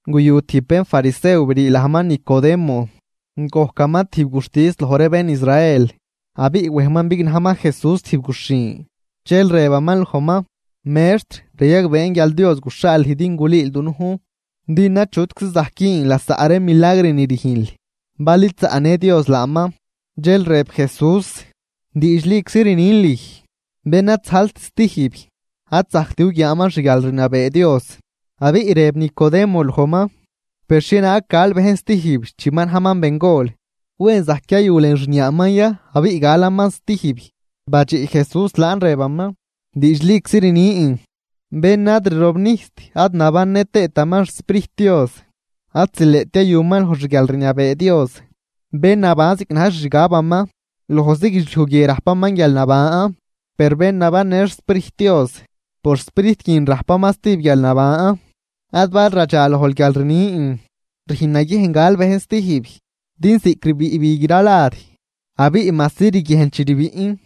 Guyu tijb bénfarisew brii lajman Nicodemo, gojcaman tijb guxtis loj ree bén Israel. Abiꞌ wejman bignajman Jesús tijb guxhin, dxel rëbaman lojman: ―Mextr, rayagbeen guial Dios guxhaal lüj din gulüül dunujn, din achutczi zajc güün lasaꞌ ree milagr ni rüjnl bal id zaꞌnë Dios laaman. Dxel rëb Jesús: ―Diidxliczi rnin lüj, bén ad zajlt stijb, ad zajct guguiaaman xguialrniabee Dios. Abiꞌ rëb Nicodemo lojman: ―Per, ¿xhienaag gal bejn stijb chi ma najman bengol? ¿Wen zajc yayu lën xniaaman ya abiꞌ galaman stijb? Badxiꞌ Jesús laan rëbaman: ―Diidxliczi rnin, bén ad rirobnijst ad nabannë tëëtaman xSprijt Dios ad zileꞌt yayuman loj xguialrniabee Dios. Bén naban ziꞌc na̱j xixgabaman, lojzi guidxliuj guie rajpaman guialnaban, per bén nabannë xSprijt Dios, por Sprijt guin rajpaman stijb guialnaban. Ad bal radxa lojl guial rnin: “Rüjn naguiejn gal bejn stijb.” Din ziꞌc rbiꞌ bi gralad abiꞌ majsi riguiejnl chi rbiꞌn,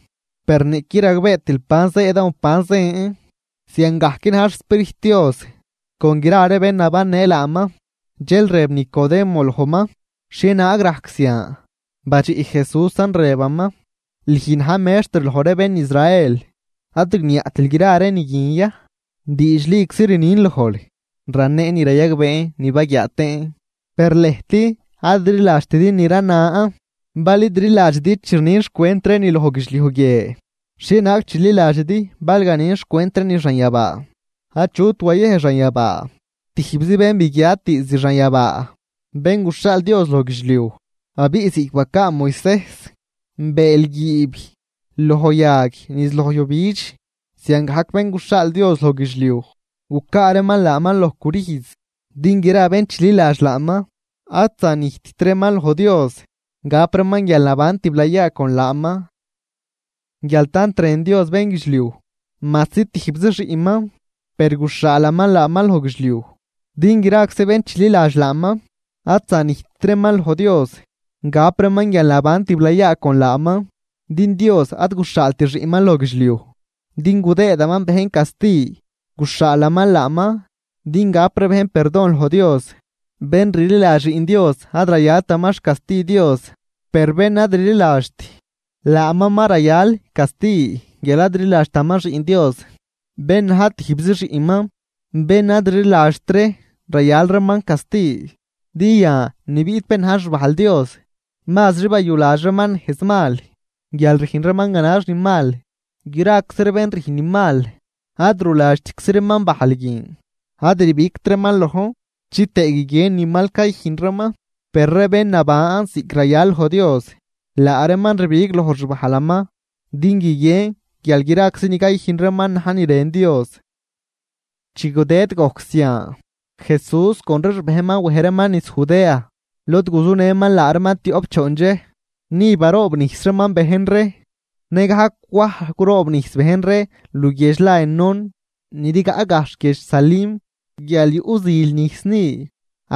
per niꞌquid ragbeetil ban zëëdan o ban zën. Ziangajc na̱j xSprijt Dios con gra ree bén nabannë laaman. Dxel rëb Nicodemo lojman: ―¿Xhienaag rajc zian? Badxiꞌ Jesúsan rëbaman: ―¿Lüj, na̱j mextr loj ree bén Israel, ad rigniaꞌtil gra ree ni guin ya? Diidxliczi rnin lojl, raneen ni rayagbeen ni baguiaa tëën, per lëjt ad rliladxtidi ni ranan. Bal id rliladxidi chi rnin xcwent ree ni loj guidxliuj guie, ¿xhienaag chililadxidi bal ganin xcwent ree ni xanyabaa? ’Achut wayej xanyabaa, tijbzi bén biguiat diizd xanyabaa, Bén guxhaal Dios loj guidxliuj. Abiꞌ ziꞌc bacaa Moisejs bëël guiib loj yag niz loj yujbidx, ziangajc Bén guxhaal Dios loj guidxliuj, gucaa reeman laaman loj crüjz, din gra bén chililadx laaman ad zanijtt reeman loj Dios, gap reeman guialnaban tiblayaa con laaman. ’Guial tant rën Dios bénguidxliuj, majsi tijbzi xiꞌnman, per guxhaalaman laaman loj guidxliuj, din graczi bén chililadx laaman ad zanijtt reeman loj Dios, gap reeman guialnaban tiblayaa con laaman. Din Dios ad guxhaalt xiꞌnman loj guidxliuj din gudëëdaman bejn casti, guxhaalaman laaman din gap ree bejn perdon loj Dios. ’Bén rliladx Xiꞌn Dios ad rayaltaman xcasti Dios. Per bén ad rliladxt, laaman ma rayal casti guial ad rliladxtaman Xiꞌn Dios, bén na̱j tijbzi xiꞌnman. Bén ad rliladxt ree rayal reeman casti, din yan ni biꞌt bén na̱j xbajl Dios, mazri bayuladx reeman nejz mal, guial rüjn reeman ganax ni mal. Graczi ree bén rüjn ni mal ad ruladxtczi reeman bajl guin, ad rbigt reeman lojn, chitëë guiguien ni mal cayüjn reeman. Per ree bén naban ziꞌc rayal loj Dios, laa reeman rbig loj xbajlaman din guiguien guial graczi ni cayüjn reeman na̱j ni rën Dios. Chi gudëd gojc zian, Jesús con ree xbejnman wej reeman niz Judea, lod guzunëman laa reeman tioꞌp choon dxej, ni baroobnijs reeman bejn ree. Nëgajc Waj curoobnijs bejn ree luguiedx la Enón, ni rigaꞌ gajxh guiedx Salim, guial yuꞌ zil nijs ni.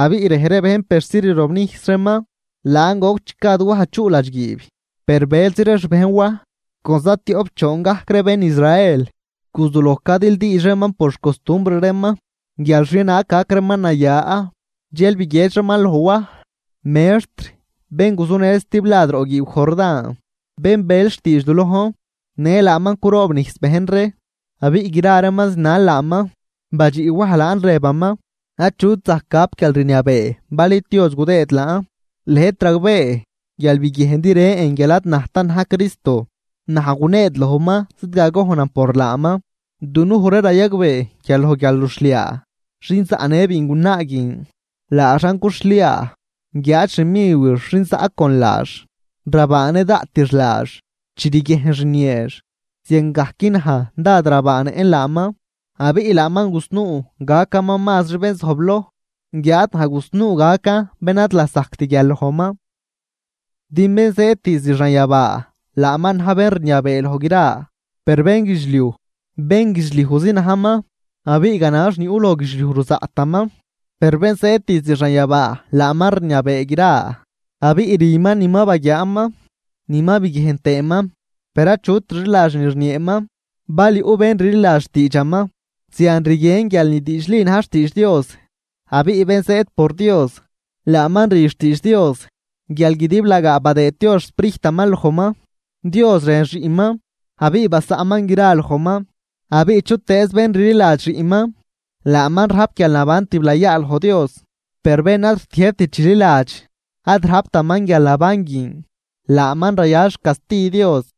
Abiꞌ rej ree bejn persi rirobnijs reeman. Laan goc chi gad Waj chuꞌ ladxguiib. Per bëlzi ree xbejn Waj, con za tioꞌp choon gajc ree bén Israel guzuloj cadildiidx reeman por xcostumbr reeman guial xhienaag gac reeman naya. Dxel biguiedx reeman loj Waj: ―Mextr, bén guzunël stiblad roꞌ guiiw Jordán, bén bel xtiidx du lojn, në laaman curoobnijs bejn ree abiꞌ gra reeman zinal laaman. Badxiꞌ Waj laan rëbaman: ―Achut zajc gap guialrniabee bal id Dios gudëë laan. Lëjt ragbee guial biguiejndi rën guial ad najtan na̱j Cristo, naj guneed lojman zidgagojnan por laaman. Dunuj ree rayagbee guial loj guialruxhliaa, xin zaꞌnë biingunaa guin, laaxan cuxhliaa, guiáad xmiwix xin zaꞌ con laax rabaanë daꞌtix laax chi riguiejnx rnieex. Ziangajc naj dád rabaanëꞌn laaman. Abiꞌ laaman gusnuu gacaman mazri bén zojbloj, guiáad naj gusnuu gacan bén ad lasajct guial lojman. ’Din bén zëëd diizd xanyabaa, laaman na̱j bén rniabee loj gra. Per bénguidxliuj, bénguidxliujzi najman abiꞌ ganax ni yuꞌ loj guidxliuj ruzaꞌtaman. Per Bén zëëd diizd xanyabaa laaman rniabee gra, abiꞌ rüman ni ma baguiaaman ni ma biguiejn tëëman, per achut rliladx ni rnieeman. Bal yuꞌ bén rliladx xtiidxaman, zian rguien guial ni diidxli na̱j xtiidx Dios. Abiꞌ bén zëëd por Dios, laaman rü xtiidx Dios guial guidiblagaa badëëd Dios xSprijtaman lojman. Dios rën Xiꞌnman abiꞌ basaꞌnman gra lojman. Abiꞌ chutëëz bén rliladx Xiꞌnman, laaman rajp guialnaban tiblayaa loj Dios. Per bén ad rtiëjbt chililadx, ad rajptaman guialnaban guin, laaman rayal xcasti Dios.